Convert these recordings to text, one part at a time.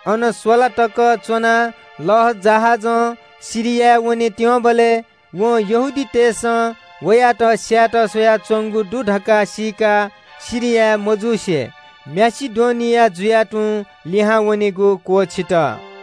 अन स्‍वला तक च्‍वने धुंकाः लःजहाजं सिरियाय् वनेत्‍यंबलय् वं यहूदीतय् नायःतय्‌सं वयात स्‍यायेत स्‍वयाच्‍वंगु दु धकाः सीकाः माकेडोनिया जुयाः तुं लिहां वनेगु क्‍वःछित।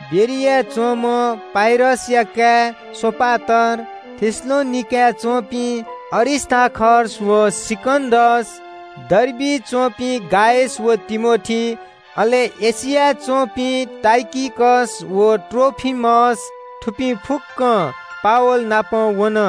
बेरियाय् च्‍वंम्‍ह पुरसया काय् सोपात्रोस, थेसलोनिकें वःपिं अरिस्‍तार्खस व सिकन्‍दस, डर्बिइ च्‍वंपिं गायस व तिमोथी, अले एशियाय् च्‍वंपिं तुखिकस व त्रोफिमस, थुपिं फुक्‍कं पावल नाप वन।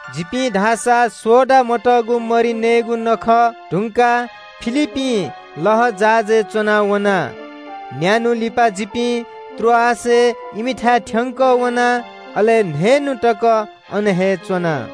जिपिं धाःसा सोडा मतःगु मरि नयेगु नखः धुंकाः फिलिप्‍पीं लःजहाजय् च्‍वनावना। न्‍यान्‍हु लिपा जिपिं त्रोआसय् इमिथाय् थ्‍यंकः वना, अले न्‍हय्‌न्‍हु तक अन हे च्‍वना।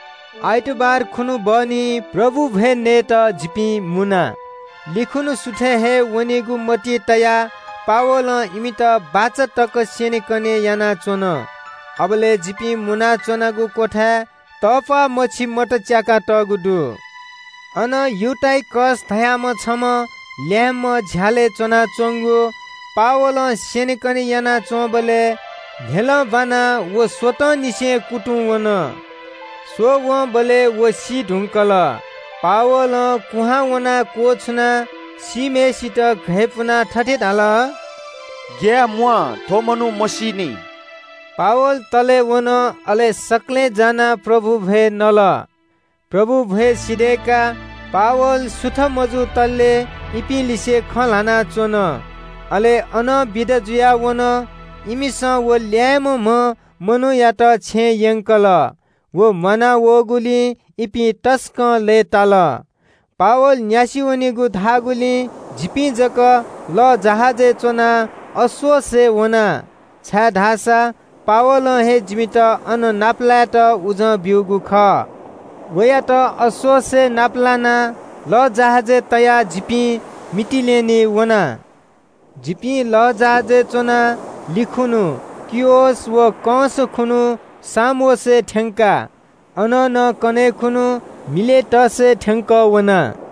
आइतबार खुन्‍हु बहनी प्रभु भ्‍वय् नयेत जिपिं मुना। कन्‍हय् खुन्‍हु सुथय् हे वनेगु मतिइ तयाः पावलं इमित बाचा तक स्‍यनेकने यानाच्‍वन। अबलय् जिपिं मुनाच्‍वनागु क्‍वथाय् तःप्‍वाः मछि मत च्‍याकातःगु दु। अन युटिकस धाःम्‍ह छम्‍ह ल्‍याय्‌म्‍ह झ्‍यालय् च्‍वनाच्‍वंगु। पावलं स्‍यनेकने यानाच्‍वंबलय् न्‍ह्यलं ब्‍वानाः व स्‍वतंनिसें कुतुंवन। स्‍वःवंबलय् व सी धुंकल। पावलं कुहां वनाः क्‍वछुनाः सीम्‍हय्‌सित घय्‌पुनाः थथे धाल – “ग्‍याये म्‍वाः, थ्‍व मनू मसीनि।” पावल तले वन, अले सकलें जानाः प्रभु भ्‍वय् नल। प्रभु भ्‍वय् सिधय्‌काः पावल सुथ मजुतले इपिं लिसे खँ ल्‍हानाच्‍वन। अले अनं बिदा जुयाः वन। इमिसं व ल्‍याय्‌म्‍हम्‍ह मनूयात छेँय् यंकल। व म्‍वाना वःगुलिं इपिं तसकं लय्‌ताल। पावल न्‍यासि वनेगु धाःगुलिं जिपिं जक लःजहाजय् च्‍वनाः अस्‍सोसय् वना, छाय्‌धाःसा पावलं हे जिमित अन नापलायेत उजं ब्‍यूगु खः। वयात अस्‍सोसय् नाप लानाः लःजहाजय् तयाः जिपिं मितिलेनेय् वना। जिपिं लःजहाजय् च्‍वनाः कन्‍हय् खुन्‍हु खियस व कंस खुन्‍हु सामोसय् थ्‍यंका। अनं नं कन्‍हय् खुन्‍हु मिलेटसय् थ्‍यंकः वना।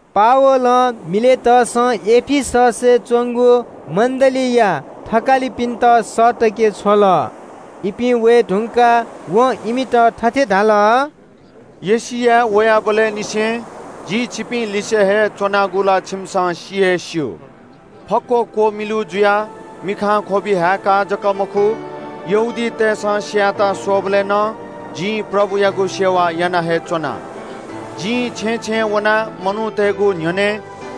पावलं मिलेटसं एफिससय् च्‍वंगु मण्‍डलीया थकालिपिन्‍त सःतके छ्वल। इपिं वये धुंकाः वं इमित थथे धाल – “एशियाय् वयाबलय् निसें जि छिकपिं लिसे हे च्‍वनागु ला छिकपिन्‍सं सि हे स्‍यू। फक्‍व क्‍वमिलु जुयाः मिखां ख्‍वबि हाय्‌काः जक मखु, यहूदीतय्‌सं स्‍यायेत स्‍वःबलय् नं जिं प्रभुयागु सेवा याना हे च्‍वना। जिं छेँय् छेँय् वनाः मनूतय्‌गु न्‍ह्यःने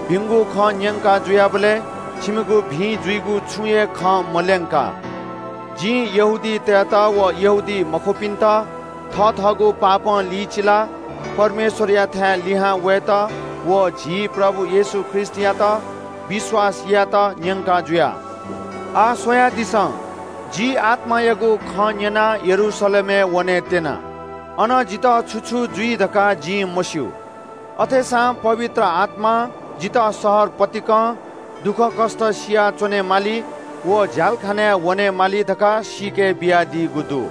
भिंगु खँ न्‍यंका जुयाबलय् छिकपिनिगु भिं जुइगु छुं हे खँ मल्‍यंका। जिं यहूदीतय्‌त व यहूदीमखुपिन्‍त पश्‍चाताप यानाः परमेश्‍वरयाथाय् लिहां वयेत व झी प्रभु येशू ख्रीष्‍टयात विश्‍वास यायेत न्‍यंका जुया। “आः स्‍वयादिसँ, जि आत्‍मायागु खँ न्‍यनाः यरूशलेमय् वनेत्‍यना। अन जितः छु छु जुइ धकाः जिं मस्‍यू। अथेसां पवित्र आत्‍मां जितः शहर पतिकं दुःखकष्‍ट सिया च्‍वनेमाली व झ्‍यालखानाय् वनेमाली धकाः सीके बियादीगु दु।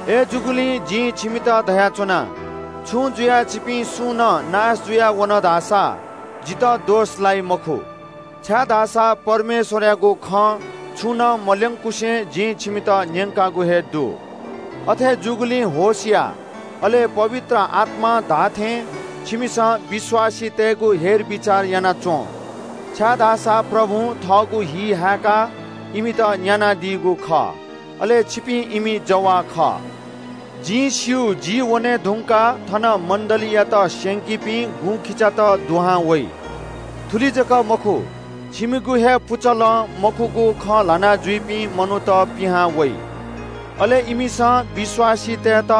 अय्‌जूगुलिं जिं छिकपिन्‍त धयाच्‍वना – छुं जुयाः छिकपिं सुं नं नाश जुयावन धाःसा जितः दोष लाइ मखु। छाय्‌धाःसा परमेश्‍वरयागु खँ छुं नं मल्‍यंकुसे जिं छिकपिन्‍त न्‍यंकागु हे दु। “अथे जूगुलिं होश यानादिसँ, अले पवित्र आत्‍मां धाःथें छिकपिन्‍सं विश्‍वासीतय्‌गु हेरबिचार यानादिसँ, छाय्‌धाःसा प्रभुं थःगु हि हाय्‌काः इमित न्‍यानादीगु खः, अले छिकपिं इमि जवाः खः। जिं स्‍यू, जि वने धुंकाः थन मण्‍डलीयात स्‍यंकीपिं गुँखिचात वइ। थुलि जक मखु, छिकपिनिगु हे पुचलं मखुगु खँ ल्‍हानाजुइपिं मनूत पिहां वइ। अले इमिसं विश्‍वासीतय्‌त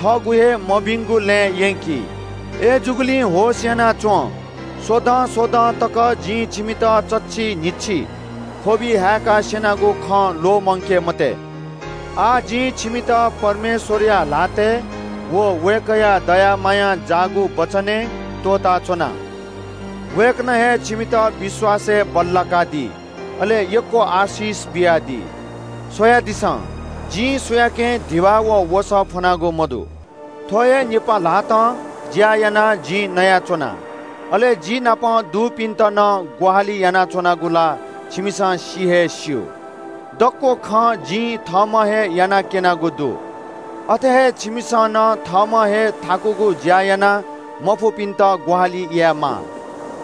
थःगु हे मभिंगु लँय् यंकी। अय्‌जूगुलिं होश यानादिसँ, स्‍वदँ स्‍वदँ तक जिं छिकपिन्‍त चच्‍छि न्‍हिच्‍छि ख्‍वबि हाय्‌काः स्‍यनागु खँ ल्‍वःमंकादी मते।” “आः जिं छिकपिन्‍त परमेश्‍वरया ल्‍हातय् व वय्‌कःया दया मायां जाःगु वचनय् त्‍वःताच्‍वना। वय्‌कलं हे छिकपिन्‍त विश्‍वासय् बल्‍लाकादी, अले यक्‍व आशिष बियादी। “स्‍वयादिसँ, जिं सुयाकें धिबा व वसः फ्‍वनागु मदु। थ्‍व हे निपा ल्‍हातं ज्‍या यानाः जिं नयाच्‍वना, अले जि नाप दुपिन्‍त नं ग्‍वाहालि यानाच्‍वनागु ला छिकपिन्‍सं सि हे स्‍यू। दक्‍व खँ जिं थःम्‍हं हे याना क्‍यनागु दु। अथे हे छिकपिन्‍सं नं थःम्‍हं हे थाकुगु ज्‍या यानाः मफुपिन्‍त ग्‍वाहालि यायेमाः।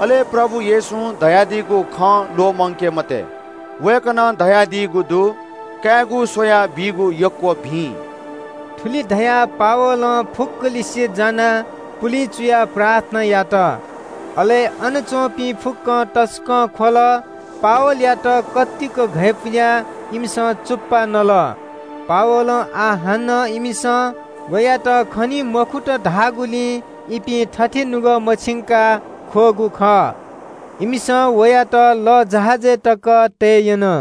अले प्रभु येशूं धयादीगु खँ ल्‍वःमंकादी मते। वय्‌कलं धयादीगु दु – ‘कायेगु स्‍वयाः बीगु यक्‍व भिं।’” थुलि धयाः पावलं फुक्‍कलिसे जानाः पुलिं चुयाः प्रार्थना यात। अले अन च्‍वंपिं फुक्‍कं तसकं ख्‍वल। पावलयात घय्‌पुयाः इमिसं चुप्‍पा नल। पावलं आः हानं इमिसं वयात खनी मखुत धाःगुलिं इपिं थथे नुगः मछिंकाः ख्‍वःगु खः। इमिसं वयात लःजहाजय् तक तये यन।